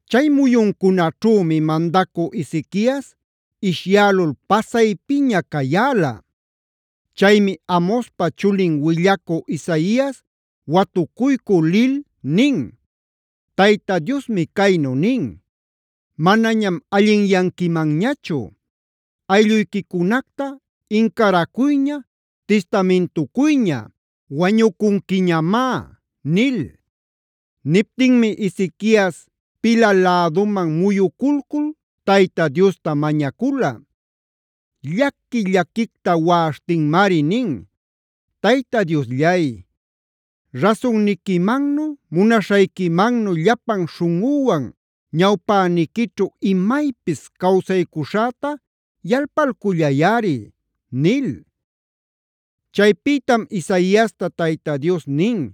Chay muyuncunaćhümi mandacü Ezequias ishyälul pasaypiña cayäla. Chaymi Amozpa chulin willacü Isaias watucuycü lil nin: “Tayta Diosmi caynu nin: ‘Manañam allinyanquimanñachu; aylluyquicunacta incaracuyña, tistamintucuyña; wañucunquiñamá’” nil. Niptinmi Ezequias pila läduman muyuculcul Tayta Diosta mañacula. Llaqui-llaquicta waꞌaśhtinmari nin: “Tayta Diosllay, rasunniquimannu, munaśhayquimannu llapan śhunꞌüwan ñawpäniquićhu imaypis cawsaycuśhäta yalpalcullayꞌari” nil. Chaypïtam Isaiasta Tayta Dios nin: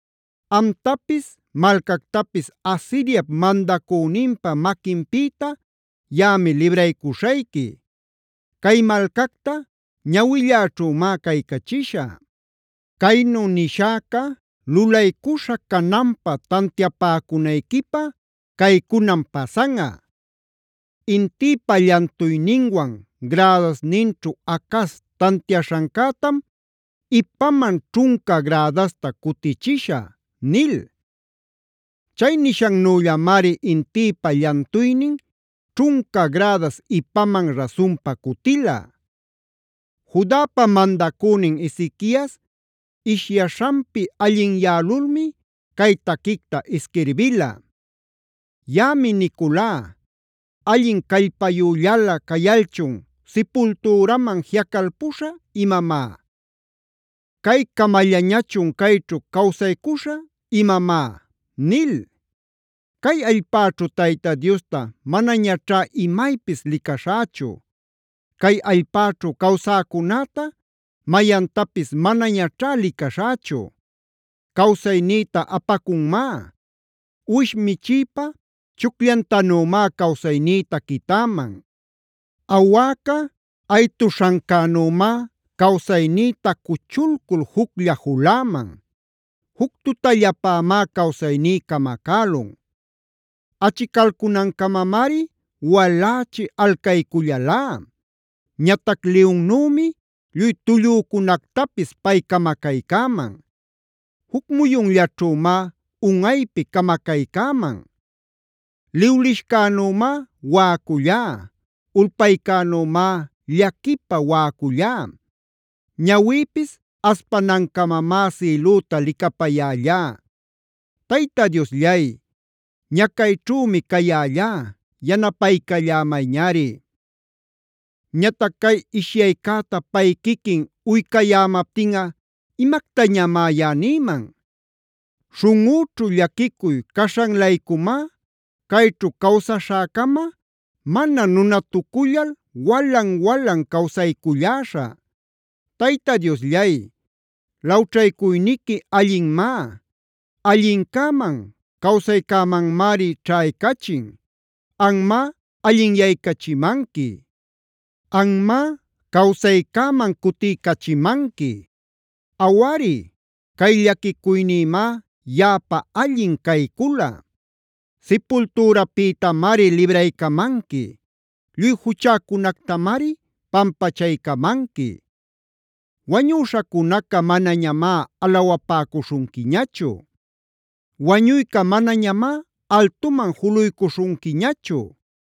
Amtapis malcactapis Asiriap mandacüninpa maquinpïta yaꞌami libraycuśhayqui. Cay malcacta ñawilläćhümá caycachishä. Caynu nishäca lulaycuśha cananpa tantiapäcunayquipä caycunam pasanꞌa: Intïpa llantuyninwan grädasninćhu Acaz tantiaśhancätam ipaman ćhunca grädasta cutichishä’” nil. Chay nishannüllamari intïpa llantuynin ćhunca gradas ipaman rasunpa cutila. Judapa mandacünin Ezequias ishyaśhanpi allinyälulmi cay taquicta isquirbila: “Yaꞌami niculá: ‘¿Allin callpayüllalä cayalchun sipultüraman jiꞌacalpuśhä imamá? ¿Cay camallañachun cayćhu cawsaycuśhä imamá?’ nil. Cay allpäćhu Tayta Diosta manañaćhá imaypis licaśhächu; cay allpäćhu cawsäcunäta, mayantapis manañaćhá licaśhächu. Cawsaynïta apacunmá; uwish michïpa chucllantanümá cawsaynïta quitäman. Awäca aytuśhancänümá cawsaynïta cuchulcul juclla juläman. Juc tutallapämá cawsayní camacälun. Achicalcunancamamari walächi alcaycullalá. Ñatac liyunnümi lluy tullücunactapis pay camacaycäman. Juc muyunllaćhümá unꞌaypi camacaycäman. Liwlishcänümá waꞌacullá; ulpaycänümá llaquipä waꞌacullá; ñawïpis aspanancamamá sïlüta licapayällá. Tayta Diosllay, ñacayćhümi cayällá; yanapaycallämayñari. “Ñatac ¿cay ishyaycäta pay quiquin uycayämaptinꞌa imactañamá yaꞌa nïman? Śhunꞌüćhu llaquicuy caśhan-laycumá cayćhu cawsaśhäcama, mana nunatucullal walan-walan cawsayculläśhä. Tayta Diosllay, lawćhaycuyniqui allinmá; allincäman, cawsaycämanmari ćhaycachin. Anmá allinyaycachimanqui; anmá cawsaycäman cutiycachimanqui. Awari, cay llaquicuynïmá yaꞌapa allin caycula. Sipultürapïtamari libraycamanqui; lluy juchäcunactamari pampachaycamanqui. Wañüśhacunaca manañamá alawapäcuśhunquiñachu; wañuyca manañamá altuman juluycuśhunquiñachu;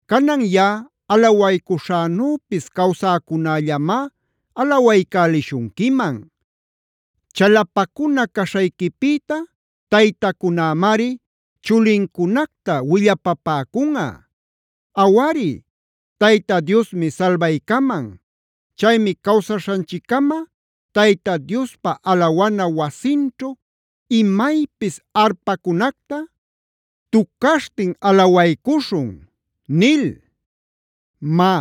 Canan yaꞌa alawaycuśhänüpis cawsäcunällamá alawaycälishunquiman. Chalapacuna caśhayquipïta taytacunämari chulincunacta willapapäcunꞌa. Awari, ¡Tayta Diosmi salbaycaman! Chaymi cawsaśhanchiccama Tayta Diospa alawana wasinćhu imaypis arpacunacta tucaśhtin alawaycuśhun” nil. Má,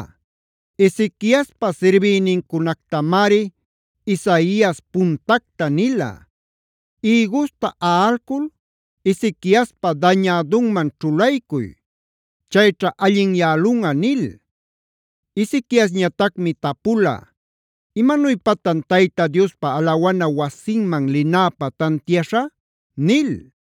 Ezequiaspa sirbïnincunactamari Isaias puntacta nila: “Ïgusta aꞌalcul Ezequiaspa dañädunman ćhulaycuy. Chayćha allinyälunꞌa” nil. Ezequiasñatacmi tapula: “¿Imanuypatan Tayta Diospa alawana wasinman linäpä tantiaśhä?”b nil.